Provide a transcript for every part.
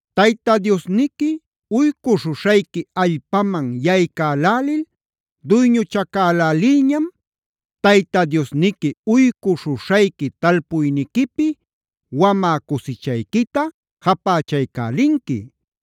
“Tayta Diosniqui uycuśhuśhayqui allpaman yaycälälil duyñuchacälälilñam, Tayta Diosniqui uycuśhuśhayqui talpuyniquipi wamä cusichayquita japächaycälinqui.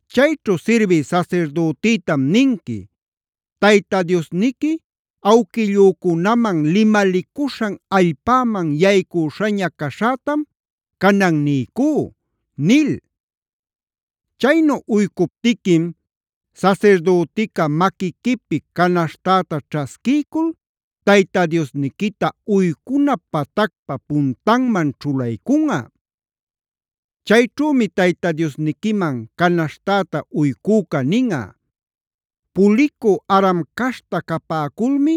Chayćhu sirbï sasirdütïtam ninqui: ‘Tayta Diosniqui awquillücunaman limalicuśhan allpäman yaycüśhaña caśhätam canan niycú’ nil. Chaynu uycuptiquim sasirdütica maquiquipï canaśhtäta ćhasquiycul Tayta Diosniquita uycuna patacpa puntanman ćhulaycunꞌa. Chayćhümi Tayta Diosniquiman canaśhtäta uycüca ninꞌa: ‘Pulicü Aram caśhta capäculmi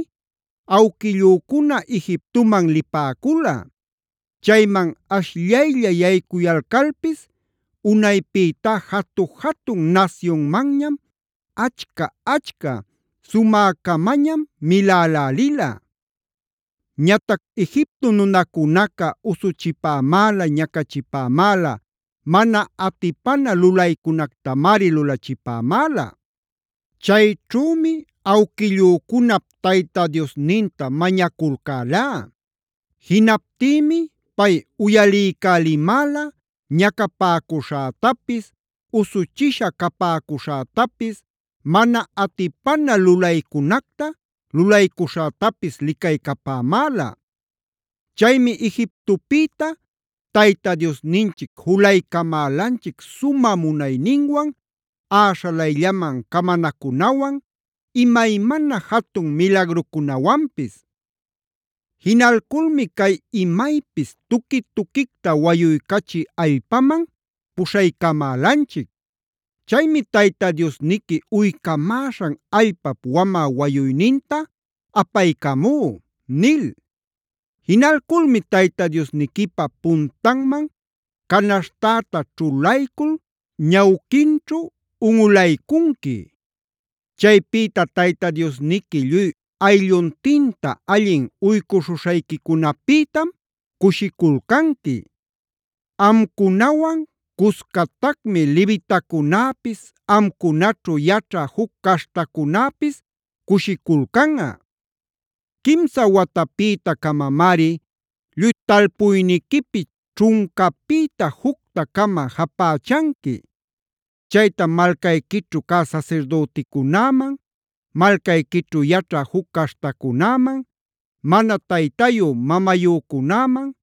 awquillücuna Egiptoman lipäcula. Chayman ashllaylla yaycuyalcalpis unaypïtá jatu-jatun nasyunmanñam, achca-achca, sumäcamañam milälälila. Ñatac Egipto nunacunaca usuchipämäla, ñacachipämäla, mana atipana lulaycunactamari lulachipämäla. Chayćhümi awquillücunap Tayta Diosninta mañaculcälá. Jinaptïmi pay uyalïcälimäla ñacapäcuśhätapis, usuchisha capäcuśhätapis, mana atipana lulaycunacta lulaycuśhätapis licaycapämäla. Chaymi Egiptopïta Tayta Diosninchic julaycamälanchic sumä munayninwan, äśhalayllaman camanacunawan, imaymana jatun milagrucunawanpis. Jinalculmi cay imaypis tuqui-tuquicta wayuycachï allpaman puśhaycamälanchic. Chaymi Tayta Diosniqui uycamäśhan allpap wamä wayuyninta apaycamú’ nil. “Jinalculmi Tayta Diosniquipa puntanman canaśhtäta ćhulaycul ñawquinćhu unꞌulacuycunqui. Chaypïta Tayta Diosniqui lluy aylluntinta allin uycuśhuśhayquicunäpïtam cushiculcanqui. Amcunawan cuscatacmi levitacunäpis, amcunaćhu yaćha juc caśhtacunäpis cushiculcanꞌa. “Quimsa watapïta-camamari lluy talpuyniquipi ćhuncapïta jucta-cama japächanqui. Chaytam malcayquićhu cä sasirdüticunäman, malcayquićhu yaćha juc caśhtacunäman, mana taytayu mamayücunäman,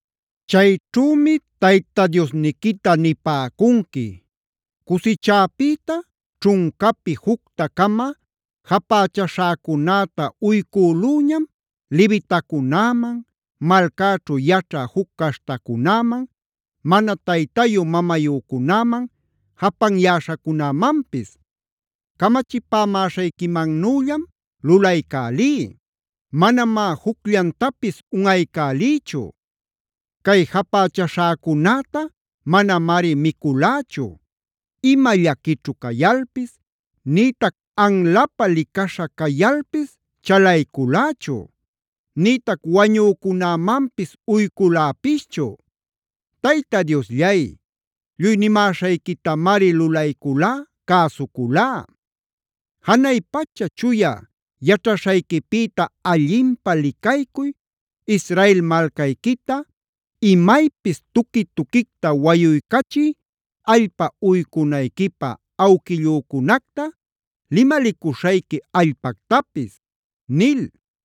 “Chayćhümi Tayta Diosniquita nipäcunqui: ‘Cusichäpïta ćhuncapi jucta-cama japächaśhäcunäta uycülüñam levitacunäman, malcäćhu yaćhä juc caśhtacunäman, mana taytayu mamayücunäman, japanyäśhacunämanpis. Camachipämäśhayquimannüllam lulaycälí; manamá jucllantapis unꞌaycäliychu. Cay japächaśhäcunäta manamari miculächu: ima llaquićhu cayalpis, nïtac anlapä licaśha cayalpis chalayculächu, nïtac wañücunämanpis uyculäpischu. Tayta Diosllay, lluy nimäśhayquitamari lulayculá, cäsuculá. Janay pacha chuya yaćhaśhayquipïta allinpä licaycuy, Israel malcayquita, imaypis tuqui-tuquicta wayuycachï allpa uycunayquipä awquillücunacta limalicuśhayqui allpactapis’ nil.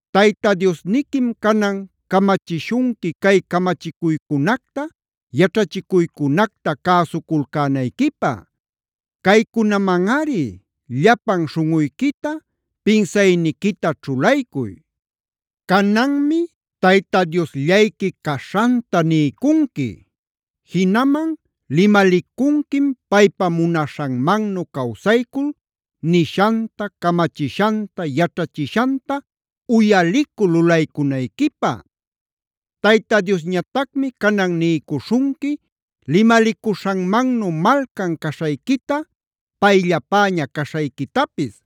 “Tayta Diosniquim canan camachishunqui cay camachicuycunacta, yaćhachicuycunacta cäsuculcänayquipä. Caycunamanꞌari llapan śhunꞌuyquita, pinsayniquita ćhulaycuy. “Cananmi Tayta Diosllayqui caśhanta niycunqui. Jinaman limalicunquim paypa munaśhanmannu cawsaycul nishanta, camachishanta, yaćhachishanta uyalicul lulaycunayquipä. Tayta Diosñatacmi canan niycuśhunqui limalicuśhanmannu malcan caśhayquita, payllapäña caśhayquitapis.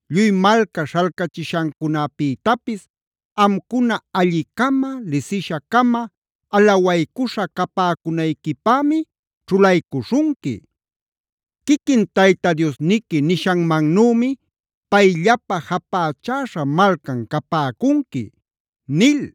Lluy malca śhalcachishancunapïtapis amcuna alli-cama, lisisha-cama, alawaycuśha capäcunayquipämi ćhulaycuśhunqui. Quiquin Tayta Diosniqui nishanmannümi payllapä japächäśha malcan capäcunqui” nil.